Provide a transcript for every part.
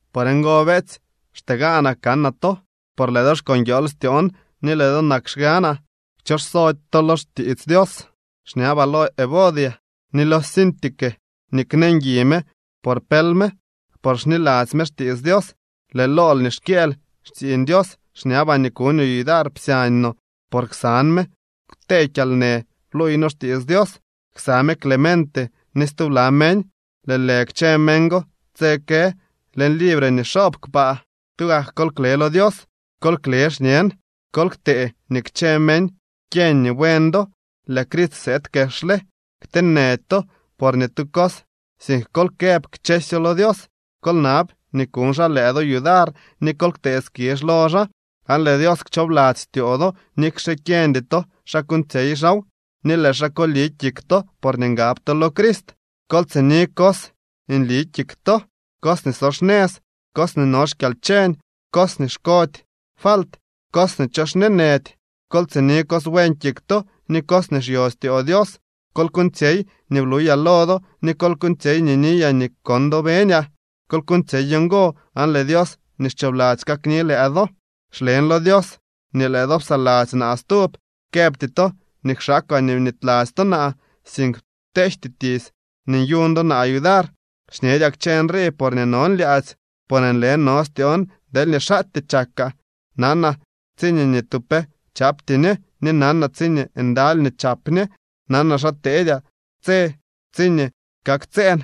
Por ngo, beetsy, xtee gaanaa kanaa to, por lëë do xko nguiool styoon ni lëë do nak xganaa. Kchoxsody to lo xtiits Dios. Xñabaa lo Evodia ni lo Síntique nii knee ngui me por pël me, por xniladzy me xtiits Dios. Lëë lool nii xkyëël xtsiiñ Dios, xñabaa nii kuñoo yudar psyañ no, por ksan me kwtee kyalnë bluuy noo xtiits Dios, ksa me Clemente ni stubla meñ. Lëë lë kchë meñ go tse kë leñ libre nii xoob kpaa. Tugak kol kle lo Dios. Kol kle xñen. Kol ktee nii kchë meñ kyeñ nii buen do. Lëë Crist sëëd kexle. Kteenëdy to por ni tu cos, sink kol këb kchësyo lo Dios. Kol nab nii kuñ xaa lëë do yudar, ni kol ktee skizh lo xaa. Aan lëë Dios kchoobladzy styoo do nikxe kyeñdy to xa kuuñtsyey xaaw, ni lëë xaa koli kik to porñee ngab to lo Crist. Kol tsini cos nli kik to, cos nii so xnëz, cos nii no xkyalcheñ, cos nii xkody falt, cos nii cho xñeenëdy. Kol tsini cos buen kik to ni cos nii xyo styoo Dios. Kol kuuñtsyey nii bluyaa lo do, ni kol kuuñtsyey nii niyaa ni kon do beñaa. Kol kuuñtsyey ngo aan lëë Dios nii xchoobladzy kakni lëë do. Xlen lo Dios nii lëë do psaladzy naa stub. Këbty to nii kwxaakaa nii bnityladzy to naa, sink pteejty tiits nii nyuñ do naa yudar. Xñedyaa kchë nrii porñee non lyaadzy, por nle no styoon deelñee xaatyee chakaa. Nanaa tsiñee ni tu pe chapty ñe ni nanaa tsiñee ndaly nii chap ñe. Nanaa xa teedyaa tse tsiñee kaktsëën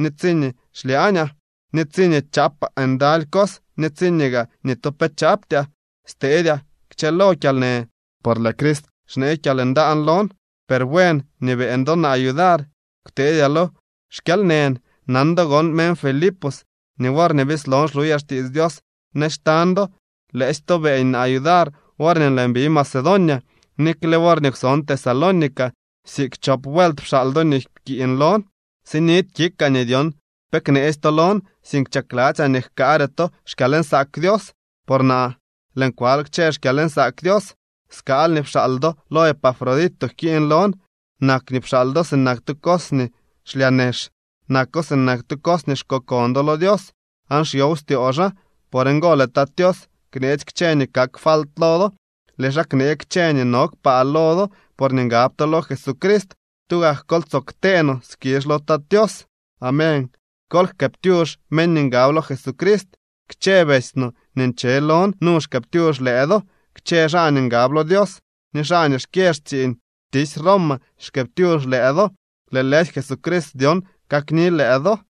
ni tsiñee xlyaañaa, ni tsiñee chaapaa ndaly cos ni tsiñee gaa ni tu pe chaptyaa. Stedyaa kchëlo kyalnë, por lëë Crist xnee kyalndaan lon. Per buen nii beeñ do naa yudar kwteedyaa lo xkyalnën. Nan do gon, meñ Filipos, nii worñee bislon xluyaa xtiits Dios nëz xtañ do, lëësy to beeñ naa yudar worñee lëën bi Macedonia. Nikle worñee kwson Tesalónica siik chop vuelt pxaal do nii pkiiñ lon. Sinidy kikaa nii dyon pe kneetsy to lon, sink chakladzyaa nii jkaare to xkyalnsaak Dios. Por naa lëën kwal kchë xkyalnsaak Dios. Skaal nii pxaal do lo Epafrodito jkiiñ lon. Nak nii pxaal do sinak tu cos nii xlyaa nex, nako sinak tu cos nii xkokon do lo Dios aan xyow styoo xaa. Por ngo lëë Tat Tios kneetsy kchë nii kak falt lo do. Lëë xaa knee kchë nii no kpaa lo do porñee ngab to lo Jesucrist. ¡Tugak kol tsoo ktee no skizh lo Tat Tios! Amén. Kol jkëëptyux meñ nii ngab lo Jesucrist. Kchë betsy no nii nche lon nu xkëëptyux lëë do. Kchë xaa nii ngab lo Dios ni xaa nii xkyë xtsiiñ xtisy Roma xkëëptyux lëë do. Lëë lëësy Jesucrist dyon kakni lëë do.